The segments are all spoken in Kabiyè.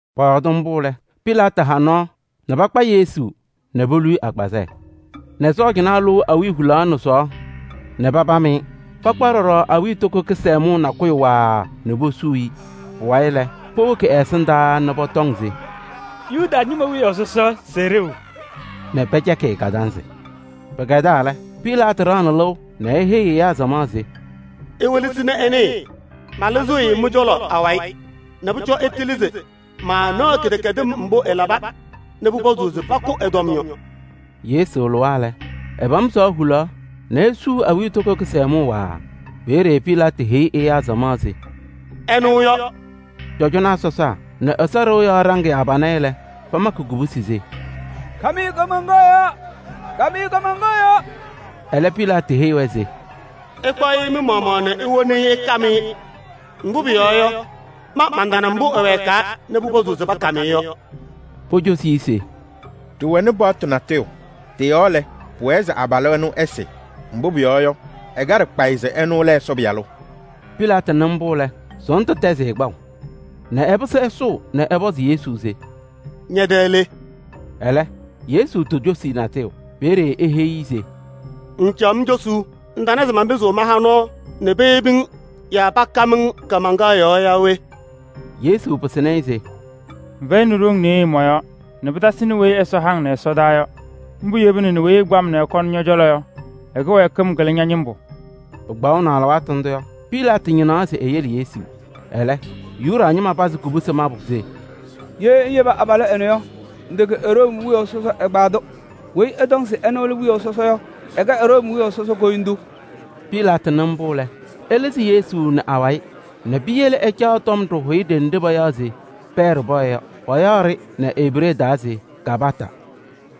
Pɔyɔɔdɩ mbʋ lɛ, Pilaatɩ ha nɔɔ nɛ pakpa Yesu nɛ polu-i agbazɛɛ nɛ sɔɔjanaa lʋʋ awiya hulaɣ nɛ sɔɔ nɛ papam-ɩ. Pakpaɣ ɖɔɖɔ awiitoko kɩsɛmʋʋ nakʋyʋ waaa nɛ posuu-i. Pʋwayɩ lɛ, powoki ɛ-ɛsɩndaa nɛ pɔtɔŋ se: “Yuda ñɩma wiyaʋ sɔsɔ! Sɛɛ ɖeu!” Nɛ pɛcɛkɩ-ɩ kadanzɩ. Pɩkɛdaa lɛ, Pilaatɩ ɖaɣnɩ lɩʋ nɛ eheyi ɛyaa samaɣ se: “Iwelesi nɛ ɩnɩɩ, malɩzɩɣ-ɩ mɩ-cɔlɔ awayɩ nɛ pʋcɔ ɩtɩlɩ se maanaɣ kɩdɛkɛdɩm mbʋ ɛlaba nɛ pʋpɔzʋʋ se pakʋ ɛ-tɔm yɔ.” Yesu lɩwa lɛ, ɛpam sɔɔ hulaɣ nɛ esuu awiitoko kɩsɛmʋʋ waaa. Peeye Pilaatɩ heyi ɛyaa samaɣ se: “Ɛnʋ yɔ!” Cɔjɔnaa sɔsaa nɛ Ɛsɔ ɖɩɣa yɔɔ ɖaŋɩyaa pana-ɩ lɛ, pamakɩ kobusi se: “Kam-ɩ kaamaŋkaɣ yɔɔ! Kam-ɩ kaamaŋkaɣ yɔɔ!” Ɛlɛ Pilaatɩ heyi-wɛ se: “Ɩkpaɣ-ɩ mɩ-maɣmaɣ nɛ iwoni-i ɩkam-ɩ. Mbʋ pʋyɔɔ yɔ, ma mantana mbʋ ɛwɛɛkaa nɛ pʋpɔzʋʋ se pakam-ɩ yɔ.” Pocosi-i se: “Ɖɩwɛnɩ paɣtʋ natʋyʋ, tɩ-yɔɔ lɛ, pʋwɛɛ se abalʋ ɛnʋ ɛsɩ. Mbʋ pʋyɔɔ yɔ, ɛkaɖɩ kpayɩ se ɛnʋ lɛ Ɛsɔ Pɩyalʋ.” Pilaatɩ nɩ mbʋ lɛ, sɔɔndʋ tɛzɩ-ɩ kpaʋ nɛ ɛpɩsɩ ɛsʋʋ nɛ ɛpɔzɩ Yesu se: “Ñɛ-tɛ le?” Ɛlɛ, Yesu tocosi-i natʋyʋ. Peeye eheyi-i se: “Ŋŋcaɣ-m cosuu? Ŋtana se manpɩzɩɣ maha nɔɔ nɛ peyebi-ŋ yaa pakam-ŋ kaamaŋkaɣ yɔɔ yaa we?” Yesu pɩsɩnɩ-ɩ se: “Ŋfɛyɩnɩ ɖoŋ nɩɩyɩ mɔ-yɔɔ nɛ pɩtasɩnɩ weyi Ɛsɔ ha-ŋ nɛ ɛsɔdaa yɔ. Mbʋ yebina nɛ weyi ɛkpa-m nɛ ɛkɔnɩ ñɔ-cɔlɔ yɔ, ɛ-kɩwɛɛkɩm kɩlɩ ña-ñɩmbʋ.” Pɩkpaɣʋ nɛ alɩwaatʋ ndʋ yɔ, Pilaatɩ ñɩnaɣ se eyele Yesu. Ɛlɛ, Yuda ñɩma pazɩ kubusi mabʋ se: “Ye ŋyebi abalʋ ɛnʋ yɔ, ŋtɛkɛ Room wiyaʋ sɔsɔ ɛgbaadʋ! Weyi ɛtɔŋ se ɛnʋ lɛ wiyaʋ sɔsɔ yɔ, ɛkɛ Room wiyaʋ sɔsɔ koyindu!” Pilaatɩ nɩ mbʋ lɛ, ɛlɩzɩ Yesu nɛ awayɩ nɛ piyele ɛcaɣ tɔm ɖɩhʋyɛ ɖenɖe payaɣ se Pɛɛ Ɖɩpɔyɛ yɔ. Payaɣ-ɖɩ nɛ Ebree taa se Gabata.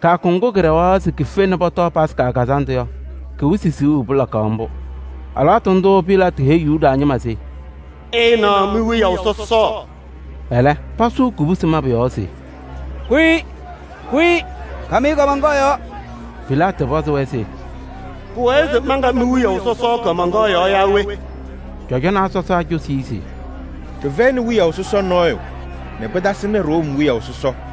Kɩyakʋ ŋgʋ kɩɖɛɣaɣ se kife Yomiye Taa Lɩʋ Kazandʋ yɔ, kɩ-wɩsɩ siɣu pɩlakaɣ mbʋ. Alɩwaatʋ ndʋʋ Pilaatɩ heyi Yuda ñɩma se: “Ɩɩnaɣ mi-wiyaʋ sɔsɔ!” Ɛlɛ, pasʋʋ kubusi mabʋ yɔɔ se: “Kʋ-ɩ! Kʋ-ɩ! Kam-ɩ kaamaŋkaɣ yɔɔ!” Pilaatɩ pɔzɩ-wɛ se: “Pʋwɛɛ se manka mi-wiyaʋ sɔsɔ kaamaŋkaɣ yɔɔ yaa we?” Cɔjɔnaa sɔsaa cosi-i se: “Ɖɩfɛyɩnɩ wiyaʋ sɔsɔ nɔɔyʋ nɛ pɩtasɩnɩ Room wiyaʋ sɔsɔ.”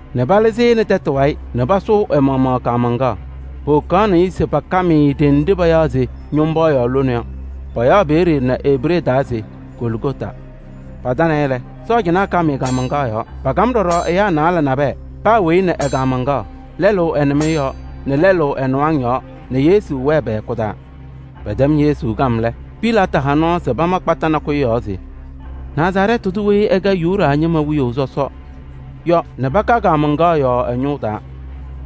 nɛ palɩzɩ-ɩ nɛ tɛtʋ wayɩ nɛ pasʋʋ ɛ-maɣmaɣ kaamaŋkaɣ. Powokaɣnɩ-ɩ se pakam-ɩ ɖenɖe payaɣ se Ñʋmbɔɔyaɣ lone yɔ. Payaɣ peeye nɛ Ebree taa se Goligota. Patanɩ-ɩ lɛ, sɔɔjanaa kam-ɩ kaamaŋkaɣ yɔɔ. Paakam ɖɔɖɔ naalɛ nabɛyɛ, paa weyi nɛ ɛ-kaamaŋkaɣ: lɛlʋ ɛ-nɩmɩyɛ yɔɔ nɛ lɛlʋ ɛ-nɩwaŋ yɔɔ nɛ Yesu wɛɛ pɛ-hɛkʋ taa. Pɛtɛm Yesu kam lɛ, Pilaatɩ ha nɔɔ se pama kpata nakʋyʋ yɔɔ se: “Nazarɛɛtɩ tʋ Yesu weyi ɛkɛ Yuda ñɩma wiyaʋ sɔsɔ” yɔ nɛ paka kaamaŋkaɣ yɔɔ ɛ-ñʋʋ taa.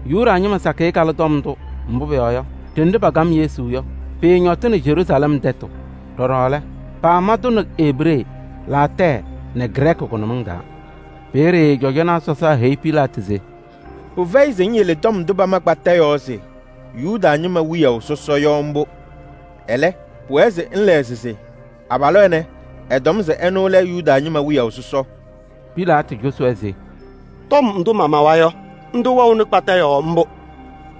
Yuda ñɩma sakɩyɛ kalɩ tɔm ndʋ. Mbʋ pʋyɔɔ yɔ, ɖenɖe pakam Yesu yɔ, pɩɩñɔtɩnɩ Yeruusalɛm tɛtʋ. Ɖɔɖɔ lɛ, paama-tʋ nɛ Ebree nɛ Laatɛɛ nɛ Grɛɛkɩ pa-taa. Peeye cɔjɔnaa sɔsaa heyi Pilaatɩ se: “Pɩfɛyɩ se ŋyele tɔm ndʋ pama kpata yɔɔ se: ‘Yuda ñɩma wiyaʋ sɔsɔ’ yɔ mbʋ. Ɛlɛ, pʋwɛɛ se ŋlɛɣzɩ se: ‘Abalʋ ɛnɛ, ɛtɔm se ɛnʋ lɛ Yuda ñɩma wiyaʋ sɔsɔ.’” Pilaatɩ cosi-wɛ se: “Tɔm ndʋ mamawa yɔ, ndʋ wɛɣnɩ kpata yɔɔ mbʋ.”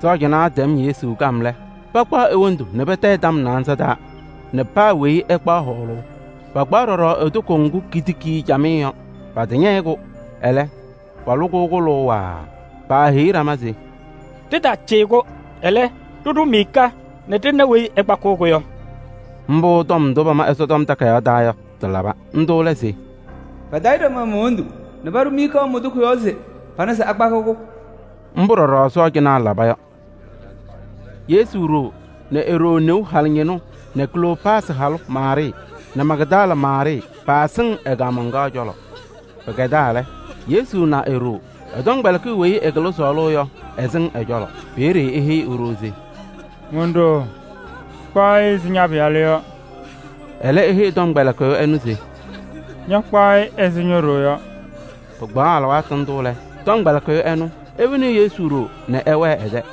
Sɔɔjanaa tɛm Yesu kam lɛ, pakpaɣ e-wondu nɛ patayɩ tɔm naanza taa nɛ paa weyi ɛkpaɣ hɔɔlʋʋ. Pakpaɣ ɖɔɖɔ e-toko ŋgʋ kitiki-i camɩyɛ yɔ. Pɛtɛñɛyɩ-kʋ, ɛlɛ, palʋ-kʋ kʋlʋʋ waaa. Paaheyi ɖama se: “Ɖɩtaacɩyɩ-kʋ, ɛlɛ, ɖɩɖʋ miika nɛ ɖɩna weyi ɛkpakɩɣ-kʋ yɔ.” Mbʋ tɔm ndʋ pama Ɛsɔtɔm Takayaɣ taa yɔ, tɩlaba. Ndʋ lɛ se: “Patayɩ ɖama mon-wondu nɛ paɖʋ miika mon-toko yɔɔ.” Mbʋ ɖɔɖɔ sɔɔjanaa laba yɔ. Yesu ɖoo nɛ e-ɖoo neu halʋ ñɩnʋ nɛ Kloopaasɩ halʋ Maarɩɩ nɛ Magdala Maarɩɩ paasɩŋ ɛ-kaamaŋkaɣ cɔlɔ. Pɩkɛdaa lɛ, Yesu na e-ɖoo, ɛ-tɔmkpɛlɩkɩyʋ weyi ɛkɩlɩ sɔɔlʋʋ yɔ, ɛsɩŋ ɛ-cɔlɔ. Peeye eheyi e-ɖoo se: “Mon-ɖoo! Kpaɣ-ɩ ɛzɩ ña-pɩyalʋ yɔ.” Ɛlɛ eheyi tɔmkpɛlɩkɩyʋ ɛnʋ se: “Ña ñakpaɣ-ɩ ɛzɩ ño-ɖoo yɔ.” Pɩkpaɣ alɩwaatʋ ndʋ lɛ, tɔmkpɛlɩkɩyʋ ɛnʋ, ewoni Yesu ɖoo nɛ ɛwɛɛ ɛ-tɛ.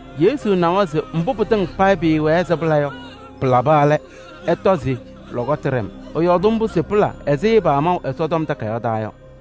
Yesu nawa se mbʋ pɩtɩŋa payɩ pɩɩwɛɛ se pɩla yɔ, pɩlaba lɛ, ɛtɔ se lɔkɔtʋ ɖɛ-m. Ɛyɔɔdɩ mbʋ se pɩla ɛzɩ pamaʋ Ɛsɔtɔm Takayaɣ taa yɔ.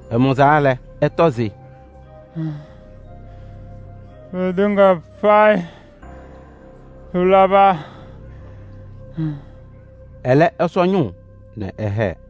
Ɛmʋzaa lɛ, ɛtɔ se: “Pɩtɩŋa payɩ pɩlaba!” Ɛlɛ ɛsɔ ñʋʋ nɛ ɛhɛɛ.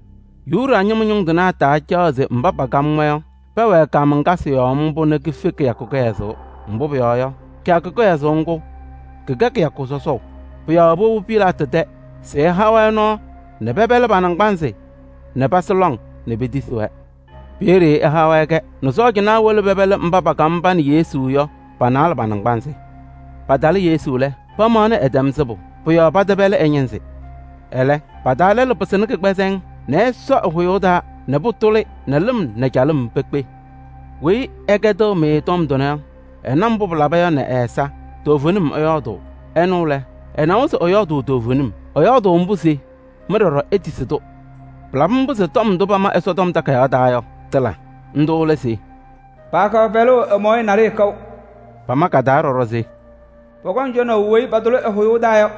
Yuda ñɩma ñʋŋ tɩnaa taacaɣ se mba pakam-wɛ yɔ, pɛwɛɛ kaamaŋkasɩ yɔɔ mbʋ nɛ kife kɩyakʋ kɩhɛzʋʋ. Mbʋ pʋyɔɔ yɔ, kɩyakʋ kɩhɛzʋʋ ŋgʋ, kɩkɛ kɩyakʋ sɔsɔʋ. Pʋ-yɔɔ powobi Pilaatɩ tɛ se ɛha-wɛ nɔɔ nɛ pɛpɛlɩ pa-naŋgbanzɩ nɛ pasɩ lɔŋ nɛ petisi-wɛ. Peeye ɛha-wɛ-kɛ nɛ sɔɔjanaa wolo pɛpɛlɩ mba pakam pa nɛ Yesu yɔ, pa-naalɛ pa-naŋgbanzɩ. Patalɩ Yesu lɛ, pamaɣnɩ ɛtɛm sɩbʋ. Pʋ-yɔɔ pɛtɛpɛlɩ ɛ-ñɩnzɩ. Ɛlɛ, pa-taa lɛlʋ pɩsɩnɩ kɩgbɛzɛŋ nɛ ɛsɔ ɛ-hʋyʋʋ taa nɛ pʋtʋlɩ nɛ lɩm nɛ calɩm pekpe. Weyi ɛkɛdɩɣ-mɩ tɔm tʋnɛ yɔ, ɛna mbʋ pɩlaba yɔ nɛ ɛ-ɛza, toovenim ɛyɔɔdʋʋ. Ɛnʋ lɛ, ɛnawa se ɛyɔɔdʋʋ toovenim. Ɛyɔɔdʋʋ mbʋ se mɩ ɖɔɖɔ itisi-tʋ. Pɩlabɩ mbʋ se tɔm ndʋ pama Ɛsɔtɔm Takayaɣ taa yɔ, tɩla. Ndʋ lɛ se: “Paakaɣ pɛlʋʋ ɛ-mɔɔyɛ naɖɩyɛ kaʋ.” Pama ka-taa ɖɔɖɔ se: “Pɔkɔŋ cɔnaʋ weyi patʋlɩ ɛ-hʋyʋʋ taa yɔ.”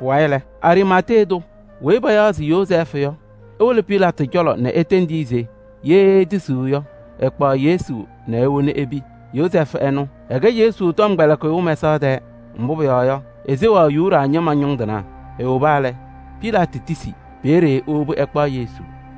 Pʋwayɩ lɛ, Ariimatee tʋ weyi payaɣ se Yozɛɛfʋ yɔ, ewolo Pilaatɩ cɔlɔ nɛ etendi-i se ye etisiɣ yɔ, ɛkpaɣ Yesu nɛ ewoni epi. Yozɛɛfʋ ɛnʋ, ɛkɛ Yesu tɔmkpɛlɩkɩyʋ mɛsaɣ tɛɛ. Mbʋ pʋyɔɔ yɔ, eseɣaɣ Yuda ñɩma ñʋŋ tɩnaa. Ewoba lɛ, Pilaatɩ tisi. Peeye ewobi ɛkpaɣ Yesu.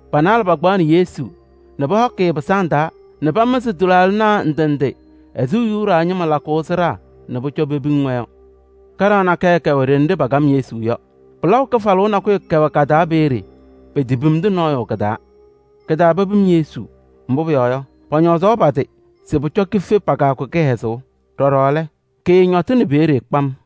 Pa-naalɛ pakpaɣnɩ Yesu nɛ pɔhɔkɩ-ɩ pɩsaŋ taa nɛ pamɩzɩ tɩlaaɖɩnaa ndɩ ndɩ ɛzɩ Yuda ñɩma lakʋʋ sɩɖaa nɛ pʋcɔ pepiŋ-wɛ yɔ. Kaɖaɣ nakɛyɛ kɛwɛ ɖenɖe pakam Yesu yɔ. Pɩlaʋ kɩfalʋʋ nakʋyʋ kɛwɛ ka-taa peeye, petepimdi nɔɔyʋ kɩ-taa. Kɩ-taa pepim Yesu, mbʋ pʋyɔɔ yɔ, pɔñɔɔzaɣ pa-tɩ se pʋcɔ kife pa-kɩyakʋ kɩhɛzʋʋ. Ɖɔɖɔ lɛ, kɩɩñɔtɩnɩ peeye kpam.